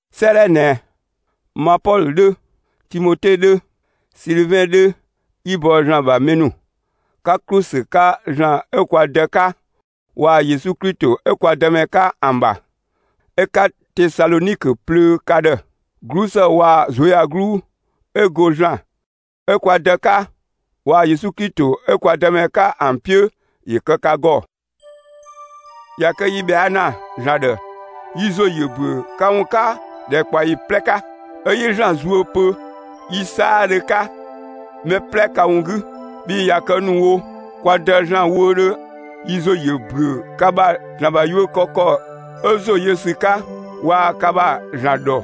'Sëëdhɛ ꞊nɛ, ma Pɔlö 'dhö, Timote 'dhö, Silivɛn 'dhö, 'yi‑ bɔ ‑Zlan ‑bha mɛ ‑nu, 'ka ‑klu ‑sü 'ka ‑Zlan 'ö kwa Dë 'ka waa‑ Yesu Klito 'ö kwa Dëmɛ 'ka ‑an ‑bha, 'ö 'ka Tesalɔnikö plöö ka ‑dhë. 'Glusë waa‑ ꞊zuöyagluu 'ö go ‑Zlan 'ö kwa Dë 'ka waa‑ Yesu Klito 'ö kwa Dëmɛ 'ka ‑an 'piö, ‑yö kë ka ‑gɔ! ꞊Ya kë yi ꞊bhɛa' ‑na ‑Zlan ‑dhë, yi ‑zo ‑yö ‑büö ka ‑wun 'ka ‑dhɛkpaɔyi 'plɛ 'ka, 'ö 'yi ‑Zlan zuö pö yi 'saadhö 'ka mɛ 'plɛ ka ‑wun 'gü. Bhii ꞊ya kë ‑nu wo, kwa Dë ‑Zlan wöödhö, yi ‑zo ‑yö ‑büö ka ‑bha ‑Zlan ‑bha yuö kë ‑kɔ 'ö ‑zo yö ‑sü 'ka, waa‑ ka ‑bha ‑Zlan ‑dhɔ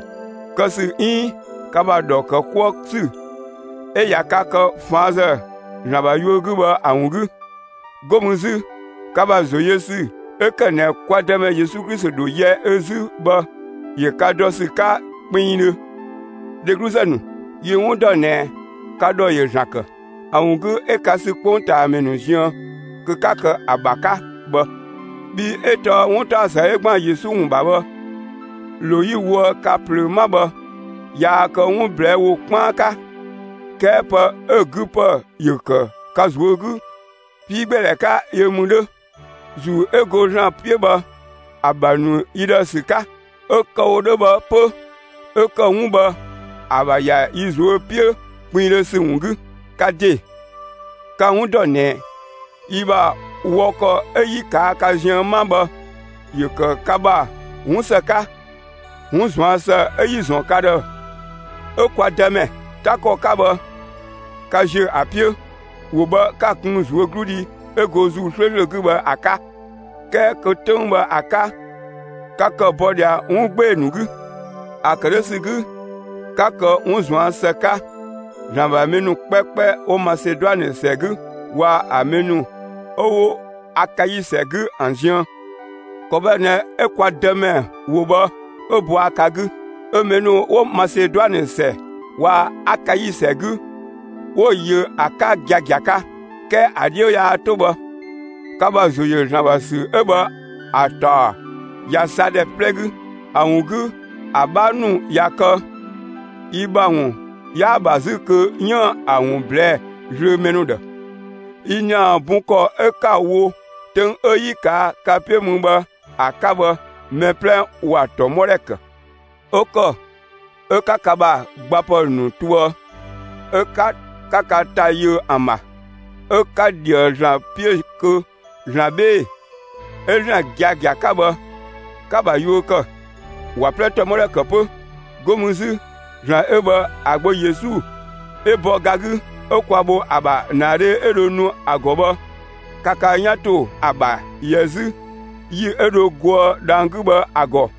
kë ‑sü 'iin ka ‑bha ‑dhɔ ‑kë 'kuë ‑sü 'ö ꞊ya ka kë ꞊faanzë ‑Zlan ‑bha yuö 'gü bhë ‑a ‑wun 'gü. 'Go mü 'zü, ka ‑bha ‑zo yö ‑sü 'ö ‑kë ꞊nɛ kwa Dëmɛ Yesu Klito ‑dho yɛ ö 'zü bhë ‑yö ka ‑dɔ ‑sü 'ka kpinngdhö. Dhegluzë ‑nu, yi‑ 'wun ‑dɔ ꞊nɛ, ka ‑dhɔ ‑yö ‑Zlan ‑kë. ‑A ‑wun 'gü 'ö ka sü 'kpongtaamɛ ‑nu ziën kö 'ka kë ‑a ‑bha 'ka bhë. Bhii 'ö tɔɔ 'wuntaɔsë 'ö ‑gban Yesu ‑wun ‑bha bhë, ‑lo 'yi‑ woë ka ꞊plöö 'ma bhë, yaa kë 'wun ꞊blɛɛ' ‑wo 'kpaan 'ka, 'kɛɛ pë 'ö‑ 'gü ‑pë ‑yö ‑kë ka ꞊zuö' 'gü 'piigbeedhɛ 'ka yö mü 'dhö, ‑Zuu 'ö go ‑Zlan 'piö bhë ‑a ‑bha ‑nu yi ‑dhë ‑sü 'ka. 'Ö kë‑ wo 'dhö bhë 'pö 'ö ‑kë 'wun bhë ‑a ‑bha ‑ya yi ꞊zuö' 'piö kpinngdhö ‑sü ‑wun 'gü. Ka ‑de, ka‑ 'wun ‑dɔ ꞊nɛ, yi ‑bha wɔ ‑kɔ 'ö 'yi ꞊kaa' ka ziën 'ma bhë, ‑yö ‑kë ka ‑bha 'wun ‑së 'ka. 'Wun ꞊zuan' ‑së 'ö 'yi‑ ‑zɔn ka ‑dhë 'ö kwa Dëmɛ 'ta ‑kɔ 'ka bhë, ka ‑ziö ‑a 'piö; ‑wo bhë 'ka‑ kun ꞊zuögludhi 'ö go ‑Zuu 'slööslö 'gü bhë ‑a 'ka, 'kɛɛ kö 'töng bhë ‑a 'ka, ka ‑kë bɔ ꞊dhia 'wun 'gbee‑ ‑nu 'gü. ‑A ‑kë 'dhö ‑sü 'gü, 'ka kë 'wun ꞊zuan' ‑së 'ka, ‑Zlan ‑bha mɛ ‑nu 'kpɛkpɛ 'wo Maseduanë ‑sɛ 'gü waa‑ ‑an mɛ ‑nu 'ö 'wo Akai ‑sɛ 'gü ‑an ziën. ‑Kɔ bhë ꞊nɛ 'ö kwa Dëmɛ ‑wo bhë 'ö bɔa ka 'gü, 'ö mɛ ‑nu 'wo Maseduanë ‑sɛ waa‑ Akai ‑sɛ 'gü 'wo‑ yö ‑a 'ka giagia 'ka. 'Kɛɛ ‑a 'dhiö yaa 'to bhë. Ka ‑bha ‑zo ‑yö ‑Zlan ‑bha ‑sü 'ö bhë ‑a ‑taɔ ꞊ya sa ‑dhɛ 'plɛ 'gü. ‑A ‑wun 'gü, ‑a 'bhaa ‑nu ꞊ya kë yi ‑bha ‑wun 'yaa‑ ‑bha 'zü kö 'yiën‑ ‑a ‑wun ꞊blɛɛ'‑ zlöö mɛ ‑nu ‑dhë. Yi ‑nia bun ‑kɔ 'ö 'ka‑ wo 'töng 'ö 'yi‑ ‑kë ka 'piö mü bhë ‑a 'ka bhë, mɛ 'plɛ ‑wa ‑tɔmɔdhɛ ‑kë. 'Ö ‑kɔ 'ö 'ka ka ‑bha gbapë ‑nu toë, 'ö 'ka ka ‑ta yöë ‑an ‑bha, 'ö 'ka ꞊dhië ‑Zlan 'piö kö ‑Zlan 'bhee‑ 'ö ‑Zlan giagia 'ka bhë 'ka‑ ‑bha yuö kë, ‑wa 'plɛ ‑tɔmɔdhɛ ‑kë 'pö. 'Go mü 'zü, ‑Zlan 'ö bhë ‑a Gbö Yesu, 'ö‑ bɔ ga 'gü, 'ö kwa bho ‑a ‑bha ‑naadhe 'ö dho nu ‑a ‑gɔ bhë, ka ka 'yan ‑to ‑a ‑bha ‑yɛ 'zü ‑yi 'ö dho goë dhang‑ 'gü bhë ‑a ‑gɔ.